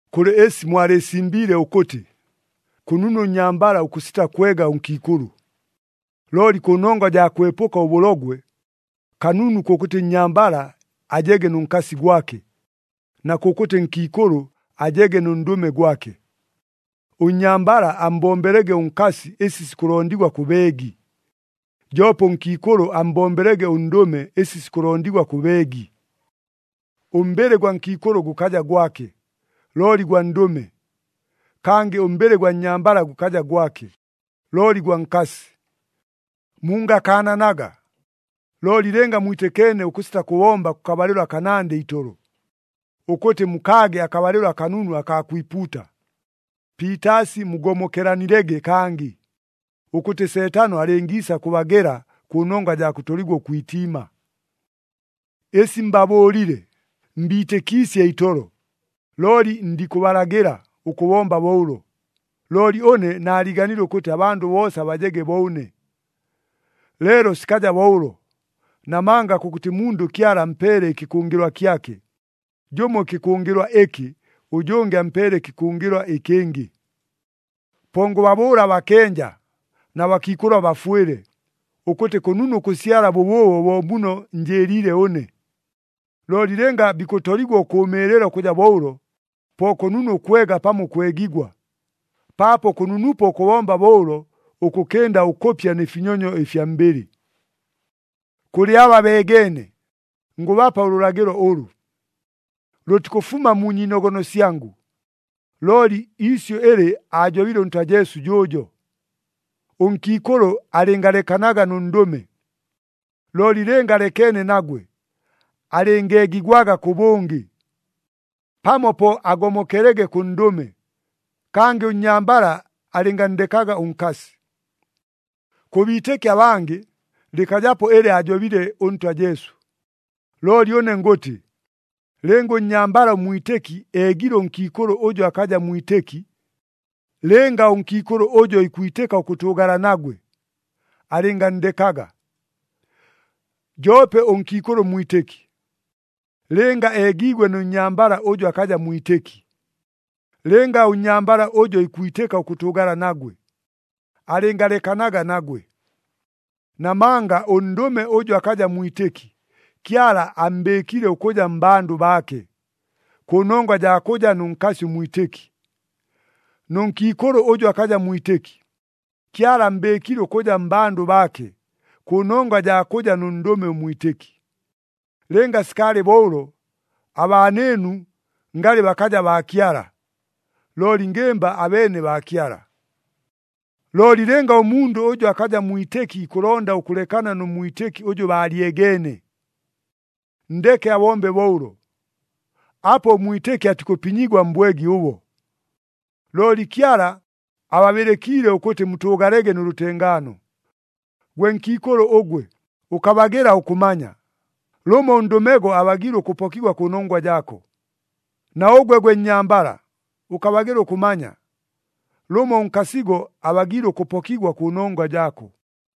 Kʉlɨ ɨsi mwalɨɨsimbiile ʉkʉtɨ, “Kʉnunu ʉnnyambala ʉkʉsita kwega ʉnkiikʉlʉ.” Looli kʉnongwa jaa kʉbwepʉka ʉbʉlogwe, kanunu kʉkʉtɨ nnyambala ajege nʉ nkasi gwake, na kʉkʉtɨ nkiikʉlʉ ajege nʉ ndʉme gwake. Ʉnnyambala ammbombelege ʉnkasi ɨsi sikʉlondigwa kʉ beegi, joope ʉnkiikʉlʉ ammbombelege ʉndʉme ɨsi sikʉlondigwa kʉ beegi. Ʉmbɨlɨ gwa nkiikʉlʉ gʉkaja gwake, looli gwa ndʉme. Kangɨ ʉmbɨlɨ gwa nnyambala gʉkaja gwake, looli gwa nkasi. Mungakaananaga, looli lɨnga mwitɨkeene ʉkʉsita kʉbomba kʉkabalɨlo akanandɨ itolo, ʉkʉtɨ mukaage akabalɨlo akanunu akaa kwipuuta. Piitaasi mugomokelanilege kangɨ, ʉkʉtɨ Seetano alɨngiisa kʉbagela kʉnongwa jaa kʉtoligwa ʉkwitiima. Ɨsi mbabʉʉlile, mbiitɨkiisye itolo, looli ndikʉbalagɨla ʉkʉbomba bo ʉlo. Looli ʉne naaliiganile ʉkʉtɨ abandʉ boosa bajege bo ʉne. Leelo sikaja bo ʉlo, namanga kʉkʉtɨ mundʉ Kyala ampeele ɨkɨkʉngɨlwa kyake, jʉmo ɨkɨkʉngɨlwa ɨkɨ, ʉjʉngɨ ampeele ɨkɨkʉngɨlwa ɨkɨngɨ. Po ngʉbabʉʉla abakenja, na bakiikʉlʉ abafwɨle, ʉkʉtɨ kʉnunu ʉkʉsyala bʉbʉʉbo bo muno njɨɨliile ʉne. Looli lɨnga bikʉtoligwa ʉkʉʉmɨɨlɨla ʉkʉja bo ʉlo, po kʉnunu ʉkwega pamo ʉkwegigwa, paapo kʉnunupo ʉkʉbomba bo ʉlo, ʉkʉkɨnda ʉkʉpya nɨ finyonyo ɨfya mbɨlɨ. Kʉlɨ aba beegeene, ngʉbapa ʉlʉlagɨlo ʉlʉ. Lʉtikʉfuma mu nyiinogono syangʉ, looli iisyʉ ɨlɨ aajobile ʉNtwa Jesu jʉʉjo. Ʉnkiikʉlʉ alɨngalekanaga nʉ ndʉme! Looli lɨnga alekeene nagwe, alɨngeegigwaga kʉbʉngɨ, pamo po agomokelege kʉ ndʉme. Kangɨ ʉnnyambala alɨnganndekaga ʉnkasi. Kʉ biitɨki abangɨ, lɨkajapo ɨlɨ aajobile ʉNtwa Jesu, looli ʉne ngʉtɨ, lɨnga ʉnnyambala ʉmwitɨki eegile ʉnkiikʉlʉ ʉjʉ akaja mwitɨki, lɨnga ʉnkiikʉlʉ ʉjo ikwitɨka ʉkʉtʉʉgala nagwe, alɨnganndekaga. Joope ʉnkiikʉlʉ ʉmwitɨki, lɨnga eegiigwe nʉ nnyambala ʉjʉ akaja mwitɨki, lɨnga ʉnnyambala ʉjo ikwitɨka ʉkʉtʉʉgala nagwe, alɨngalekanaga nagwe. Namanga ʉndʉme ʉjʉ akaja mwitɨki, Kyala ammbɨɨkile ʉkʉja mmbandʉ baake, kʉnongwa jaa kʉja nʉ nkasi ʉmwitɨki. Nʉ nkiikʉlʉ ʉjʉ akaja mwitɨki, Kyala ammbɨɨkile ʉkʉja mmbandʉ baake, kʉnongwa jaa kʉja nʉ ndʉme ʉmwitɨki. Lɨnga sikaalɨ bo ʉlo, abaanɨɨnu ngalɨ bakaja baa Kyala, looli ngɨmba abeene baa Kyala. Looli lɨnga ʉmundʉ ʉjʉ akaja mwitɨki ikʉlonda ʉkʉlekana nʉ mwitɨki ʉjʉ baalyegeene, nndeke abombe bo ʉlo. Apo ʉmwitɨki atikʉpinyigwa mbwegi ʉbo. Looli Kyala ababɨlɨkiile ʉkʉtɨ mutʉʉgalege nʉ lʉtengaano. Gwe nkiikʉlʉ ʉgwe, ʉkabagɨla ʉkʉmanya! Lʉmo ʉndʉmego abagiile ʉkʉpokigwa kʉnongwa jaako. Na ʉgwe gwe nnyambala, ʉkabagɨla ʉkʉmanya! Lʉmo ʉnkasigo abagiile ʉkʉpokigwa kʉnongwa jaako.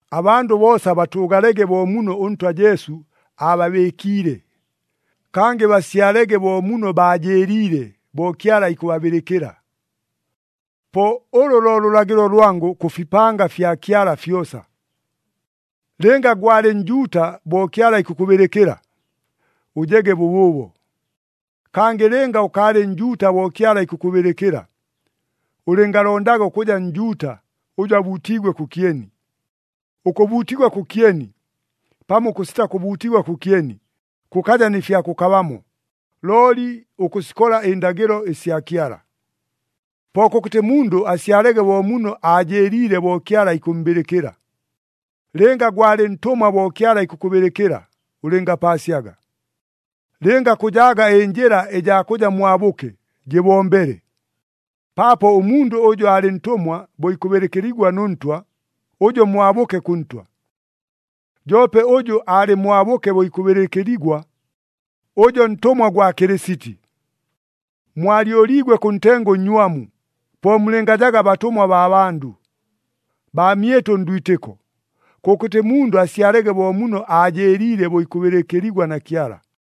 Abandʉ boosa batʉʉgalege bo muno ʉNtwa Jesu aababɨɨkiile, kangɨ basyalege bo muno baajɨɨliile bo Kyala ikʉbabɨlɨkɨla. Po ʉlʉ lo lʉlagɨlo lwangʉ kʉ fipanga fya Kyala fyosa. Lɨnga gwalɨ Njuuta bo Kyala ikʉkʉbɨlɨkɨla, ʉjege bʉbʉʉbo. Kangɨ lɨnga ʉkaalɨ Njuuta bo Kyala ikʉkʉbɨlɨkɨla, ʉlɨngalondaga ʉkʉja Njuuta ʉjʉ abuutiigwe kʉkyeni. Ʉkʉbuutigwa kʉkyeni, pamo ʉkʉsita kʉbuutigwa kʉkyeni, kʉkaja nɨ fya kʉkabamo, looli ʉkʉsikola ɨndagɨlo ɨsya Kyala. Po kʉkʉtɨ mundʉ asyalege bo muno aajɨɨliile bo Kyala ikʉmmbɨlɨkɨla. Lɨnga gwalɨ ntʉmwa bo Kyala ikʉkʉbɨlɨkɨla, ʉlɨngapaasyaga. Lɨnga kʉjaaga ɨnjɨla ɨjaa kʉja mwabʉke, jɨbombele. Paapo ʉmundʉ ʉjʉ aalɨ ntʉmwa bo ikʉbɨlɨkɨligwa nʉ Ntwa, ʉjo mwabʉke kʉ Ntwa. Joope ʉjʉ aalɨ mwabʉke bo ikʉbɨlɨkɨligwa, ʉjo ntʉmwa gwa Kɨlɨsiti. Mwalyʉliigwe kʉ ntengo ʉnnywamu. Po mulɨngajaga batʉmwa baa bandʉ. Baamyɨtʉ ndwitɨko, kʉkʉtɨ mundʉ asyalege bo muno aajɨɨliile bo ikʉbɨlɨkɨligwa na Kyala.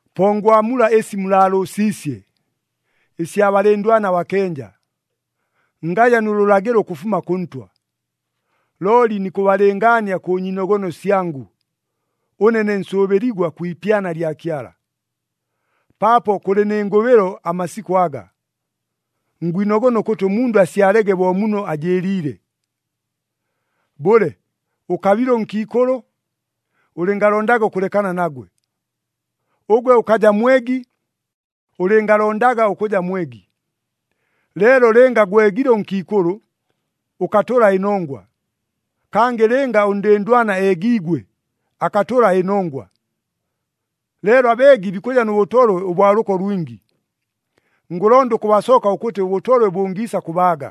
Po ngwamula ɨsi mulaalʉʉsiisye, ɨsya balɨndwana abakenja. Ngaja nʉ lʉlagɨlo ʉkʉfuma kʉ Ntwa. Looli nikʉbalɨngaania kʉ nyiinogono syangʉ, ʉne ne nsʉʉbɨligwa kwi ipyana lya Kyala. Paapo kʉlɨ nɨ ngʉbɨlo amasikʉ aga, ngwinogona ʉkʉtɨ ʉmundʉ asyalege bo muno ajɨɨliile. Bʉle, ʉkabile ʉnkiikʉlʉ? Ʉlɨngalondaga ʉkʉlekana nagwe. Ʉgwe ʉkaja mwegi? Ʉlɨngalondaga ʉkʉja mwegi. Leelo lɨnga gwegile ʉnkiikʉlʉ, ʉkatʉla ɨnongwa. Kangɨ lɨnga ʉndɨndwana eegiigwe, akatʉla ɨnongwa. Leelo abeegi bikʉja nʉ bʉtolwe ʉbwa lʉko lwingi. Ngʉlonda ʉkʉbasoka ʉkʉtɨ ʉbʉtolwe bʉngiisa kʉbaaga.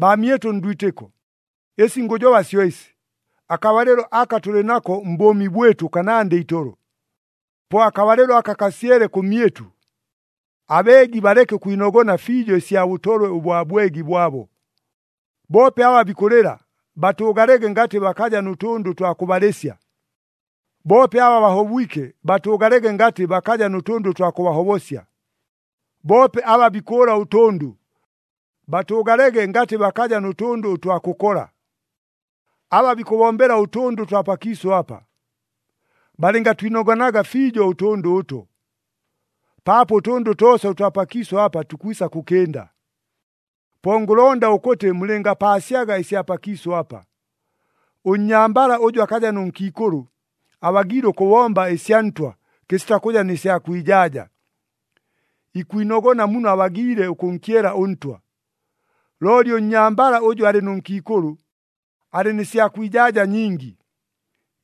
Baamyɨtʉ ndwitɨko, ɨsi ngʉjoba syo ɨsi, akabalɨlo aka tʉlɨ nako mbʉʉmi bwɨtʉ kanandɨ itolo. Po akabalɨlo aka kasyele kʉmyɨtʉ, abeegi baleke ʉkwinogona fiijo ɨsya bʉtolwe ʉbwa bwegi bwabo. Boope aba bikʉlɨla, batʉʉgalege ngatɨ bakaja nʉ tʉndʉ ʉtwa kʉbalɨsya. Boope aba bahobwike, batʉʉgalege ngatɨ bakaja nʉ tʉndʉ ʉtwa kʉbahobosya. Boope aba bikʉʉla ʉtʉndʉ, batʉʉgalege ngatɨ bakaja nʉ tʉndʉ ʉtwa kʉkola. Aba bikʉbombela ʉtʉndʉ ʉtwa pakiisʉ apa, balɨngatwinogonaga fiijo ʉtʉndʉ ʉto. Paapo ʉtʉndʉ toosa ʉtwa pakiisʉ apa tukwisa kʉkɨnda. Po ngʉlonda ʉkʉtɨ mulɨngapaasyaga ɨsya pakiisʉ apa. Ʉnnyambala ʉjʉ akaja nʉ nkiikʉlʉ, abagiile ʉkʉbomba ɨsya Ntwa kɨsita kʉja nɨ sya kwijaaja, ikwinogona muno abagiile ʉkʉnkyela ʉNtwa. Looli ʉnnyambala ʉjʉ alɨ nʉ nkiikʉlʉ, alɨ nɨ sya kwijaaja nyingi,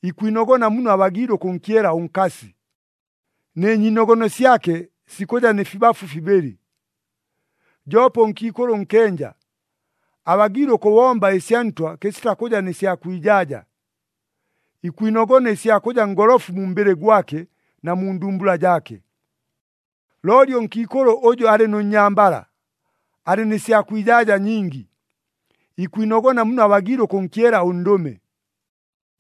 ikwinogona muno abagiile ʉkʉnkyela ʉnkasi, nɨ nyiinogono syake sikʉja nɨ fibafu fibɨlɨ. Joope ʉnkiikʉlʉ ʉnkenja, abagiile ʉkʉbomba ɨsya Ntwa kɨsita kʉja nɨ sya kwijaaja, ikwinogona ɨsya kʉja ngolofu mu mbɨlɨ gwake na mu ndumbula jaake. Looli ʉnkiikʉlʉ ʉjʉ alɨ nʉ nnyambala, alɨ nɨ sya kwijaaja nyingi, ikwinogona muno abagiile ʉkʉnkyela ʉndʉme.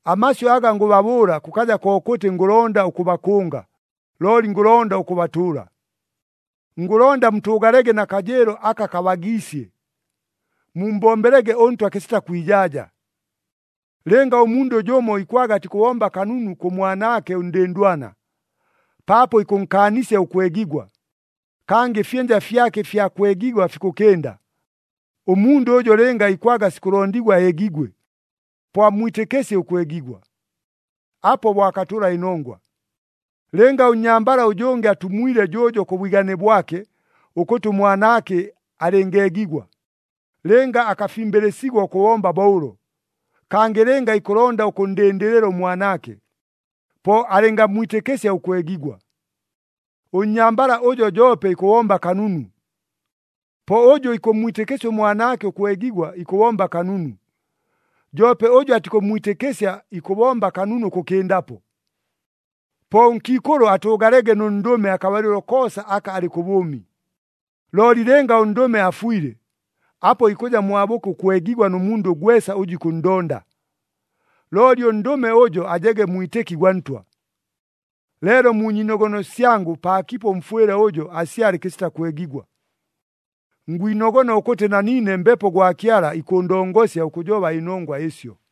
Amasyʉ aga ngʉbabʉʉla kʉkaja kokʉtɨ ngʉlonda ʉkʉbakʉnga, looli ngʉlonda ʉkʉbatʉʉla. Ngʉlonda mutʉʉgalege na kajɨɨlo aka kabagiisye, mummbombelege ʉNtwa kɨsita kwijaaja. Lɨnga ʉmundʉ jʉmo ikwaga atikʉbomba kanunu kʉ mwanaake ʉndɨndwana, paapo ikʉnkaanisya ʉkwegigwa, kangɨ ɨfyɨnja fyake ɨfya kwegigwa fikʉkɨnda, ʉmundʉ ʉjo lɨnga ikwaga sikʉlondigwa eegigwe, po ammwitɨkɨsye ʉkwegigwa. Apo bo akatʉla ɨnongwa. Lɨnga ʉnnyambala ʉjʉngɨ atumwile jʉʉjo kʉ bwigane bwake ʉkʉtɨ ʉmwanaake alɨngeegigwa, lɨnga akafimbɨlɨsigwa ʉkʉbomba bo ʉlo, kangɨ lɨnga ikʉlonda ʉkʉnndɨndɨlɨla ʉmwanaake, po alɨngammwitɨkɨsya ʉkwegigwa. Ʉnnyambala ʉjo joope ikʉbomba kanunu. Po ʉjʉ ikʉmmwitɨkɨsya ʉmwanaake ʉkwegigwa ikʉbomba kanunu. Joope ʉjʉ atikʉmmwitɨkɨsya ikʉbomba kanunu ʉkʉkɨndapo. Po ʉnkiikʉlʉ atʉʉgalege nʉ ndʉme akabalɨlo koosa aka alɨ kʉ bʉʉmi. Looli lɨnga ʉndʉme afwile, apo ikʉja mwabʉke ʉkwegigwa nʉ mundʉ gwesa ʉjʉ ikʉnndonda, looli ʉndʉme ʉjo ajege mwitɨki gwa Ntwa. Leelo mu nyiinogono syangʉ paakipo ʉmfwɨle ʉjo asyale kɨsita kwegigwa. Ngwinogona ʉkʉtɨ na niine Mbepo gwa Kyala ikʉʉndongosya ʉkʉjoba ɨnongwa ɨsyo.